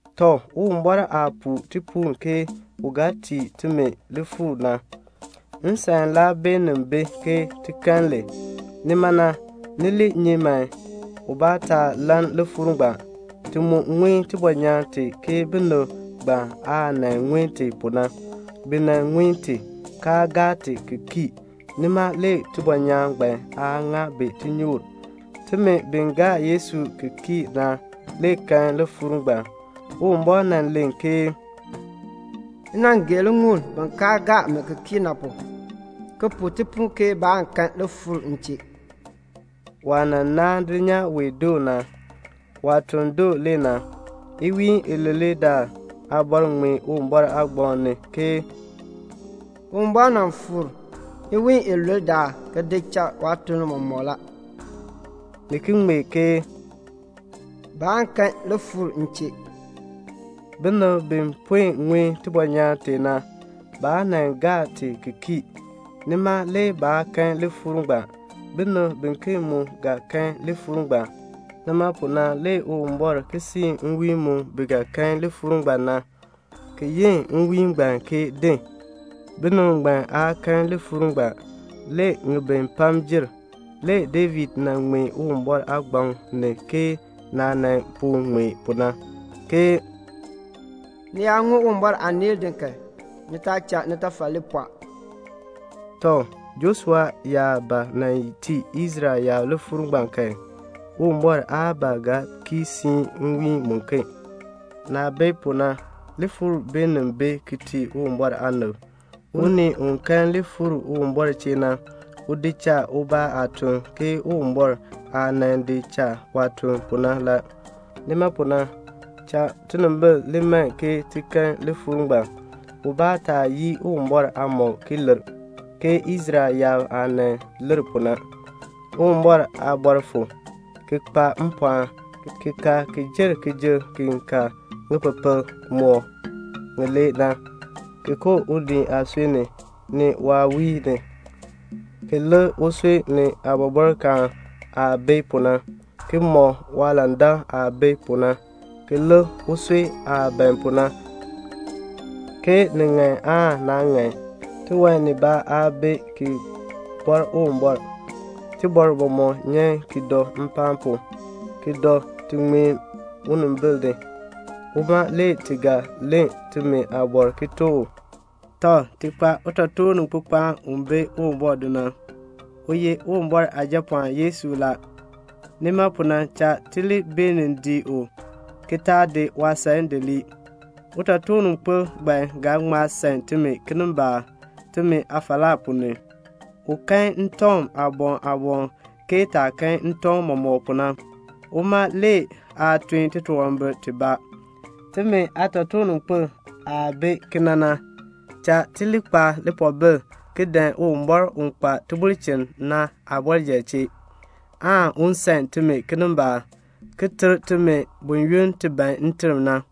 Tɔ, Uwumbɔr aah puu tipuul ke u ga tii timi lifuur na, nsan laa beenin bi ke ti kan li. Nima na, ni li nyi man, ubaa taa lann lifuur ngbaan. Ti mu ŋun tibɔnyaan tee ke binib ngbaan aah ŋun ti pu na. Bi ŋun ti, kaa gaa kii ti, nima le tibɔnyaan ngbaan aa ŋa bi tinyoor. Timi bi gaa Yesu ki kii na le kan lifuur ngbaan. Uwumbɔr nan len ke "M nan gee liŋuul bin kaa gaa mi ki kii na pu, ki puu tipuul ke baan kan lifuur m chee." Waah naan dulnyaa wee doo na, waatuln doo le na. Iwiin ilule daal aabɔr ŋmee Uwumbɔr aagbaŋ ni ke "Uwumbɔr nan fuur iwiin ilule daal ki di cha waatuln mɔmɔk la." Ni ki ŋmee ke "Baan kan lifuur m chee." Binib bi puen ŋun tibɔnyaan tee na, baa gaa ti ki kii, nima le baa kan lifuur ngbaan. Binib biken mu ga kan lifuur ngbaan. Nima pu na le Uwumbɔr ki siin nwiin mu bi ga kan lifuur ngbaan na, ki yi nwiin ngbaan ke "Din." Binib ngbaan aa kan lifuur ngbaan; le ŋibin pam jer, le David ŋmee Uwumbɔr aagbaŋ ni ke naah nan puen ŋmee pu na, ke "Ni yaa ŋun Uwumbɔr aaneel din kan, ni taa cha nitafal li pɔɔ." Tɔ, Joshua yaa ba tii Israel yaab lifuur ngbaan kan, Uwumbɔr aa ba ga ki siin nwiin muken. Naah bi pu na, lifuur le gur ki tii Uwumbɔr aanib. Unii u kan lifuur Uwumbɔr chee na, u di cha uma ubaa aatuln la, ke Uwumbɔr aah di cha waatuln pu na. Nima pu na, cha tinimbil li man ti kan lifuur ngbaan, ubaa taa yii Uwumbɔr aamɔb ki lir, ke Israel yaab aah lir pu na. Uwumbɔr aaliin fu, ki kpa mpɔɔn, ki ka ki jer kijuk ki ka ŋipepel mɔk ŋilee na, ki koo ni unii aasui ni, ni waawiin ni, ki lik usui ni aabɔbɔrkaan aah bi pu na, ki mɔk waalandak aah bi pu na, ki lik usui aah ban pu na, ke ni ŋan aan naa ŋan. Tiwan nibaa aa bi ki bɔr Uwumbɔr. Tibɔr mɔmɔk nyan mpaan pu, ki dɔ ti ŋmeen unimbil ni. Uma le ti ga len timi aabɔr ki tuk u. Tɔ, ti kpa utotoorninkpikpaan u bi Uwumbɔr do na. U ye Uwumbɔr Aajapɔɔn Yesu la. Nima pu na cha ti li beenin dii u ki taa di waasan di lii. Utotoorninkpil ngbaan ga ŋma san timi kinimbaak timi aafalaa ponn ni. U kan ntɔŋ aaboŋ aaboŋ ke taah kan ntɔŋ mɔmɔk pu na. Uma le aa tun titunwambir tibaa. Timi aatotoorninkpil aah bi kena na, cha ti li kpa lipoobil ki dan Uwumbɔr u kpa tibulchin na aabɔrjal chee, aan u san timi kinimbaak, ki ter timi buyoonn ti ban nterm na.